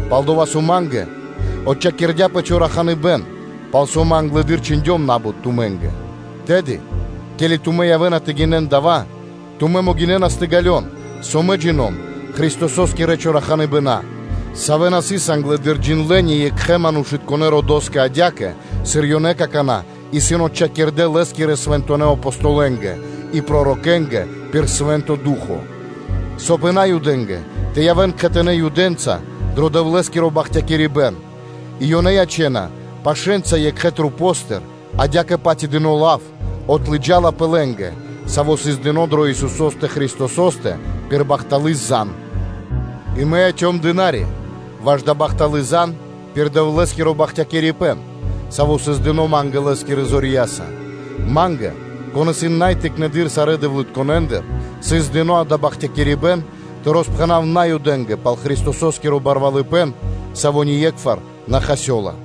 пал-дова́ со ма́нгэ отчхакирдяпэ чораханыбэн, пал со мэ англэды́р чхиндём на́бут тумэ́нгэ, тэды, ке́ли тумэ́ явэ́на тэ гинэн дава́, тумэ́ могинэ́нас тэ ґалён, со мэ джина́в Христосо́скирэ чораханыбэна, савэ́ на сыс англэды́р джиндлэ́ ни екхэ́ манушытконэ́ родо́скэ адя́кэ, сыр ёнэ какана́ исын отчхакирдэ Лэ́скирэ Свэнтонэ́ Апостолэнгэ и пророкэнгэ пир Свэ́нто Ду́хо (Фа́но), соб (кай) и Наюдэ́нгэ тэ явэ́н кхэтанэ́ Юдэнца дро Дэвлэ́скиро бахтякирибэ́н и, соб (кай) ёнэ тэ ячэн пашэ́нца екхэ масэ́ндыр, адя́кэ-паць и дыно́ лав отлыджалапэ лэ́нгэ, саво́ сыс дыно́ дро Исусо́стэ Христосо́стэ пир бахталы́ зан. И мэ яцём дына́ри (служы́телё) ваш дая́ бахталы́ зан пир Дэвлэ́скиро бахтякирибэ́н, саво́ сыс дыно́ ма́нгэ Лэ́скирэ зорья́са. Ма́нгэ, кон исын най тыкнэды́р сарэ́ дэвлытконэндыр, сыс дыно́ дава́ бахтякирибэ́н тэ роспхэнав Наюдэ́нгэ пал Христосо́скиро барвалыпэ́н, саво́ ние́кхвар на хасёла.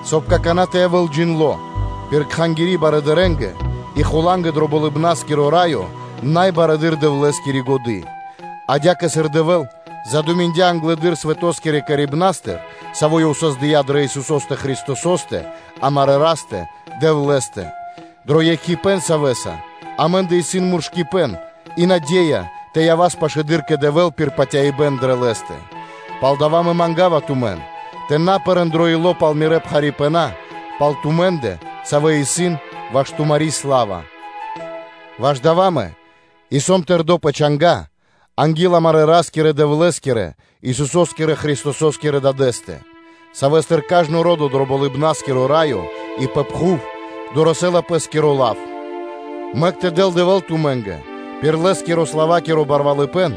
Соб (кай) какана́ тэ явэ́л джиндлы пир Кхангири́ барыдырэ́нгэ и хула́нгэ дро Болыбна́скиро Раё бари Дэвлэ́скири годы́, адя́кэ, сыр Дэвэ́л задуминдя англэды́р свэто́скирэ создыибнастыр, саво́ Ёв создыя́ дрэ Исусо́стэ Христосо́стэ, амарэ́ Растэ-Дэвлэ́стэ, дро екхипэ́н Савэ́са амэ́ндэ исын муршыпэн и наде́я тэ явас пашылэды́р кэ Дэвэ́л пир патяибэ́н дрэ Лэ́стэ. Палдава́ мэ манга́ва тумэн, тэ на пэрэ́н илэ́са пал мирэ́ пхарипэна пал тумэ́ндэ, савэ́ исын ваш тумари́ сла́ва. Ваш дава́ мэ и сом тэрдо́ пэ чанга́ анги́л амарэ́ Ра́скирэ-Дэвлэ́скирэ, Исусо́скирэ Христосо́скирэ Дадэ́стэ, Савэ́стыр кажно ро́до дро Болыбна́скиро Раё и пэ пхув дорэсэ́ла пэ́скиро лав, мэк тэ дэл Дэвэ́л тумэ́нгэ пир Лэ́скирэ-славакиро барвалыпэ́н,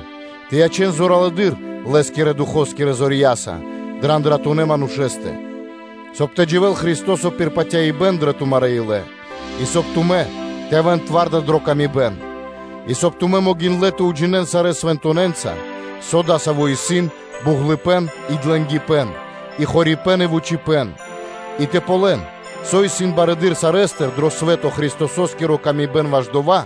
тэ ячэн зоралэды́р Лэ́скирэ Духо́скирэ зорья́са дрэ андратунэ́ манушэ́стэ, соб (кай) тэ дживэ́л Христо́со пир патяибэ́н дрэ тумарэ́ илэ, и соб (кай) тумэ́ тэ явэ́н зоралэ́ дрэ паты́в екх кэ екх, и соб (кай) тумэ́ могиндлэ́ тэ уджинэ́н сарэ́ свэнтонэ́нца, со дасаво исын буґлыпэ́н и длэнгипэ́н, и хорипэ́н, и вучипэ́н, и тэ ґалён, со исын барэды́р сарэ́стыр пэ свэ́то Христососкири ла́ска ваш дова́,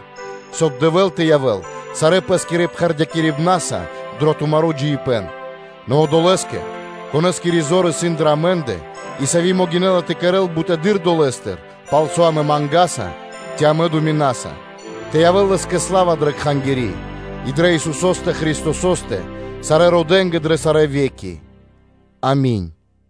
соб (кай) Дэвэ́л тэ явэ́л сарэ́ пэ́скирэ пхэрдыпнаса дро тумаро́ джиибэ́н. Нэ Одолэ́скэ, Конэ́скири зор исын дрэ амэ́ндэ, и сави́ могинэ́ла тэ кэрэ́л бутэды́р долэ́стыр, пал со амэ мангаса, ци амэ думинаса, тэ явэ́л Лэ́скэ сла́ва дрэ Кхангири́ и дрэ Исусо́стэ Христосо́стэ сарэ́ родэ́нгэ дрэ сарэ́ ве́ки. Ами́нь.